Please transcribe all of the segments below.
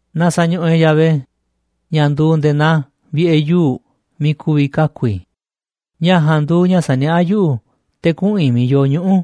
Na sa̱ñuꞌuꞌ e̱ꞌ Yahvé, ña̱ nduuꞌ nde̱e̱ naa vi̱ꞌe̱ yuu̱ꞌ miiꞌ ku̱vi̱ kaku̱ i̱. Ña̱ ja̱a̱nꞌ nduuꞌ ña̱ saniaꞌá yuꞌu̱ te̱ kuꞌu̱n i̱ miiꞌ yoo ñuꞌu̱,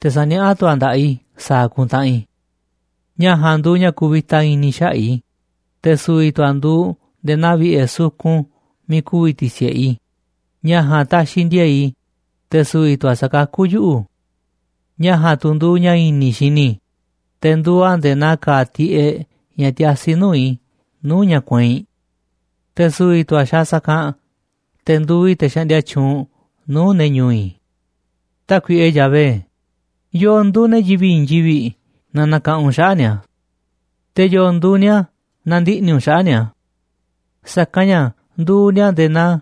te̱ saniaꞌá tu̱ a̱ nda̱ꞌaꞌ i̱ sa̱a̱ ku̱ntaꞌanꞌ i̱. Ña̱ ja̱a̱nꞌ nduuꞌ ña̱ kuvita i̱ni̱ xaꞌa̱ꞌ i̱, te̱ su̱vi̱ tu̱ a̱ nduuꞌ nde̱e̱ naa vi̱ꞌe̱ sukun miiꞌ ku̱vi̱ ti̱si̱ꞌe i̱. Ña̱ ja̱a̱nꞌ taxiꞌ ndi̱e̱e̱ꞌ i̱, te̱ su̱vi̱ tu̱ a̱ sakakú yuꞌu̱. Ña̱ ja̱a̱nꞌ tu̱ nduuꞌ ña̱ i̱ni̱ i̱ xini i̱, te̱ nduuꞌ a̱ nde̱e̱ naa ka̱a̱ tiꞌeꞌ ña̱ tiasi nuu̱ꞌ i̱ nuu̱ꞌ ña̱ kueinꞌ. Te̱ su̱vi̱ tu̱ a̱ ni̱ xa̱a̱ sa̱kanꞌ, te̱ nduuꞌ i̱ te̱ xaꞌndia tyuunꞌ nuu̱ꞌ ne̱ ñu̱u̱ i̱. Tákuiꞌe Yahvé, ¿yo̱o̱ nduuꞌ ne̱ yivi̱ꞌ i̱i̱n yivi̱ꞌ na nakaꞌanꞌ u̱nꞌ xaꞌa̱ꞌ ni̱a̱? Te̱, ¿yo̱o̱ nduuꞌ ni̱a̱ na ndiꞌni̱ u̱nꞌ xaꞌa̱ꞌ ni̱a̱? Sa̱kanꞌ ña̱ nduuꞌ ni̱a̱ nde̱e̱ naa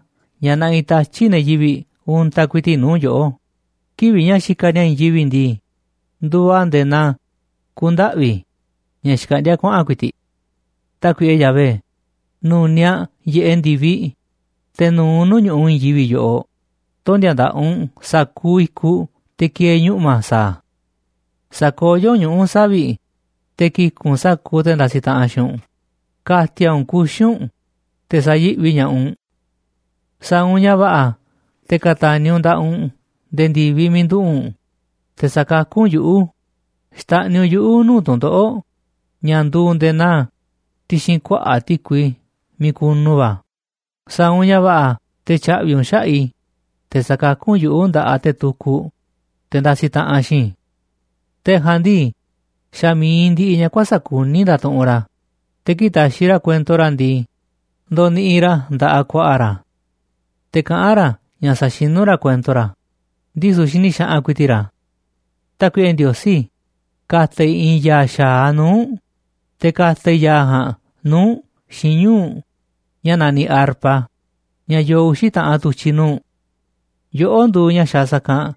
ña̱ naꞌiꞌ tatyi̱ꞌ ne̱ yivi̱ꞌ untaꞌ ku̱i̱ti̱ꞌ nuu̱ꞌ yoꞌó, kivi̱ꞌ ña̱ xikaꞌ ni̱a̱ i̱i̱n yivi̱ꞌ ndii, nduuꞌ a̱ nde̱e̱ naa ku̱ndaꞌvi̱ ña̱ xkaꞌndíá kuaꞌa̱n ku̱i̱ti̱ꞌ. Tákuiꞌe Yahvé, nu̱niaꞌ yiꞌeꞌ ndi̱viꞌ, te̱ nu̱u̱ u̱nꞌ nuu̱ꞌ ñu̱ꞌuꞌ i̱i̱n yivi̱ꞌ yoꞌoꞌ, tondi̱a̱ nda̱ꞌaꞌ u̱nꞌ sa̱kuuꞌ i̱kuꞌ te̱ ki̱e̱e̱ ñuꞌma̱ sa̱a̱ a̱. Sa̱koyó u̱nꞌ ñuꞌu̱ savi̱ꞌ, te̱ ki̱ku̱ꞌ u̱nꞌ sa̱kuuꞌ te̱ ndasiꞌ taꞌanꞌ xiinꞌ u̱nꞌ, ka̱ti̱a̱ u̱nꞌ kuxi̱ u̱nꞌ, te̱ sa̱yi̱ꞌvi ña̱ꞌaꞌ u̱nꞌ. Sa̱a̱ u̱nꞌ ña̱ va̱ꞌa̱ te̱ ka̱ta̱ni̱ u̱nꞌ nda̱ꞌaꞌ u̱nꞌ nde̱e̱ ndi̱viꞌ miiꞌ nduꞌu̱ꞌ u̱nꞌ, te̱ sa̱kakú u̱nꞌ yuꞌu̱, xta̱ꞌniꞌ u̱nꞌ yuꞌu̱ nuu̱ꞌ tu̱ndoꞌo̱ꞌ ña̱ nduuꞌ nde̱e̱ naa ti̱xi̱n kuaꞌa̱ꞌ ti̱kui miiꞌ kunu va̱, sa̱a̱ u̱nꞌ ña̱ va̱ꞌa̱ te̱ tya̱ꞌvi̱ u̱nꞌ xaꞌa̱ꞌ i̱, te̱ sa̱kakú u̱nꞌ yuꞌu̱ nda̱ꞌaꞌ te̱ tukuꞌ, te̱ ndasiꞌ taꞌanꞌ xiinꞌ i̱. Te̱ ja̱a̱nꞌ ndii, xa̱ mi̱iꞌ ndiꞌiꞌ ña̱ kuäsa̱ꞌ kuní ndatuꞌunꞌ ra̱, te̱ kii̱ꞌ taxiꞌ ra̱ kuento ra̱ ndii, ndoniꞌiꞌ ra̱ nda̱ꞌaꞌ ku̱a̱ꞌa̱ ra̱, te̱ kaꞌán ra̱ ña̱ sa̱xinú ra̱ kuento ra̱, ndisu̱ xini xaꞌanꞌ ku̱i̱ti̱ꞌ ra̱. Tákuiꞌe Ndiosí, ka̱ta̱ i̱ i̱i̱n ya̱a̱ xa̱aꞌ nuu̱ꞌ u̱nꞌ, te̱ ka̱ta̱ i̱ ya̱a̱ ja̱a̱nꞌ nuu̱ꞌ u̱nꞌ xiinꞌ ñuu̱ꞌ ña̱ naniꞌ arpa, ña̱ yoo uxi̱ taꞌanꞌ tu̱tyi̱ nuu̱ꞌ. Yoꞌó nduuꞌ ña̱ xaaꞌ sa̱kanꞌ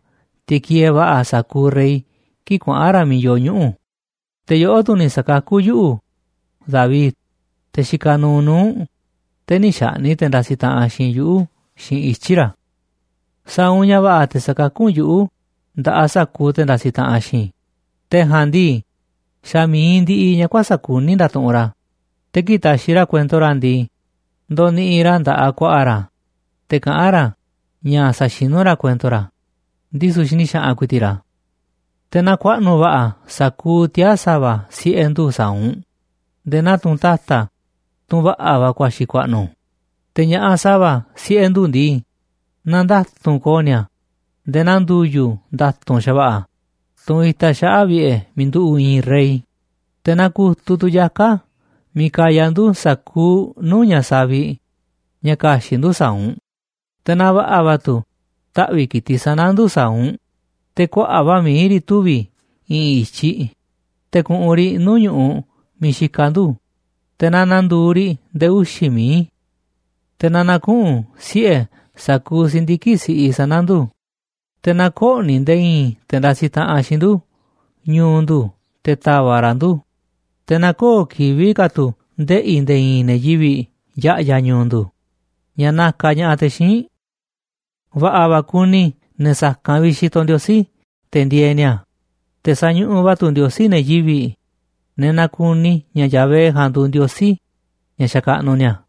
te̱ kieeꞌ va̱ꞌa̱ sa̱kuuꞌ rey kii̱ꞌ kuaꞌa̱n ra̱ miiꞌ yoo ñuꞌu̱, te̱ yoꞌó tu̱ ni̱ sa̱kakú yuꞌu̱, David, te̱ xikaꞌ nuuꞌ nuu̱ꞌ u̱nꞌ, te̱ nï̱ xaꞌni̱ꞌ te̱ ndasiꞌ xiinꞌ i̱ yuꞌu̱ xiinꞌ ityi̱ ra̱. Sa̱a̱ u̱nꞌ ña̱ va̱ꞌa̱ te̱ sa̱kakú u̱nꞌ yuꞌu̱ nda̱ꞌaꞌ sa̱kuuꞌ te̱ ndasiꞌ taꞌanꞌ xiinꞌ i̱, te̱ ja̱a̱nꞌ ndii, xa̱ mi̱iꞌ ndiꞌiꞌ ña̱ kuäsa̱ꞌ kuní ndatuꞌunꞌ ra̱, te̱ kii̱ꞌ taxiꞌ ra̱ kuento ra̱ ndii, ndoniꞌiꞌ ra̱ nda̱ꞌaꞌ ku̱a̱ꞌa̱ ra̱, te̱ kaꞌán ra̱ ña̱ sa̱xinú ra̱ kuento ra̱, ndisu̱ xini xaꞌanꞌ ku̱i̱ti̱ꞌ ra̱. Te̱ na ku̱a̱ꞌnu̱ va̱ꞌa̱ sa̱kuuꞌ tiaa̱ sa̱va̱ siꞌe̱ ndu̱ sa̱a̱ u̱nꞌ nde̱e̱ naa tunꞌ ta̱ta̱, tunꞌ va̱ꞌa̱ va̱ ku̱a̱xi̱ ku̱a̱ꞌnu̱, te̱ ña̱ꞌaꞌ sa̱va̱ siꞌe̱ ndu̱ ndii, na nda̱tu̱nꞌ ko̱o̱ ni̱a̱ nde̱e̱ naa ndu̱yu̱ nda̱tu̱nꞌ xa̱va̱ꞌa̱, tunꞌ itaꞌ xaꞌa̱ꞌ vi̱ꞌe̱ miiꞌ nduꞌu̱ꞌ i̱i̱n rey. Te̱ na ku̱tuꞌ tu̱ yaka̱ miiꞌ kaya ndu̱ sa̱kuuꞌ nuu̱ꞌ ña̱ savi̱ꞌ ña̱ ka̱xi̱ꞌ ndu̱ sa̱a̱ u̱nꞌ, te̱ na va̱ꞌa̱ va̱ tu̱ taꞌvi̱ꞌ ki̱tiꞌ sana̱ ndu̱ sa̱a̱ u̱nꞌ, te̱ kuaꞌa̱ꞌ va̱ mií riꞌ tuvi̱ i̱ꞌi̱n i̱tyiꞌ, te̱ ku̱ꞌu̱n riꞌ nuu̱ꞌ ñu̱ꞌuꞌ miiꞌ xikaꞌ ndu̱, te̱ na na̱ndu̱u̱ riꞌ nde̱e̱ uxi̱ mií. Te̱ na na̱kuꞌu̱n siꞌe̱ sa̱kuuꞌ si̱ndiki̱ꞌ siꞌi sana̱ ndu̱, te̱ na kö̱ꞌni̱ nde̱e̱ i̱i̱n te̱ ndasiꞌ taꞌanꞌ xiinꞌ ndu̱ ñu̱u̱ ndu̱ te̱ ta̱va̱ꞌ ra̱ ndu̱, te̱ na köo̱ꞌ kivi̱ꞌ ka̱ tu̱ ndeꞌi̱ nde̱e̱ i̱i̱n ne̱ yivi̱ꞌ ya̱ꞌya̱ ñu̱u̱ ndu̱ ña̱ nakaꞌ ña̱ꞌaꞌ te̱ xíinꞌ. Va̱ꞌa̱ va̱ kuni ne̱ sa̱kanꞌ vi̱ꞌ xitoꞌ Ndiosí te̱ ndieeꞌ ni̱a̱, te̱ sañuꞌuꞌ va̱ tu̱ Ndiosí ne̱ yivi̱ꞌ, ne̱ nakuni ña̱ Yahvé ja̱a̱nꞌ nduuꞌ Ndiosí ña̱ xakaꞌnuꞌ ni̱a̱.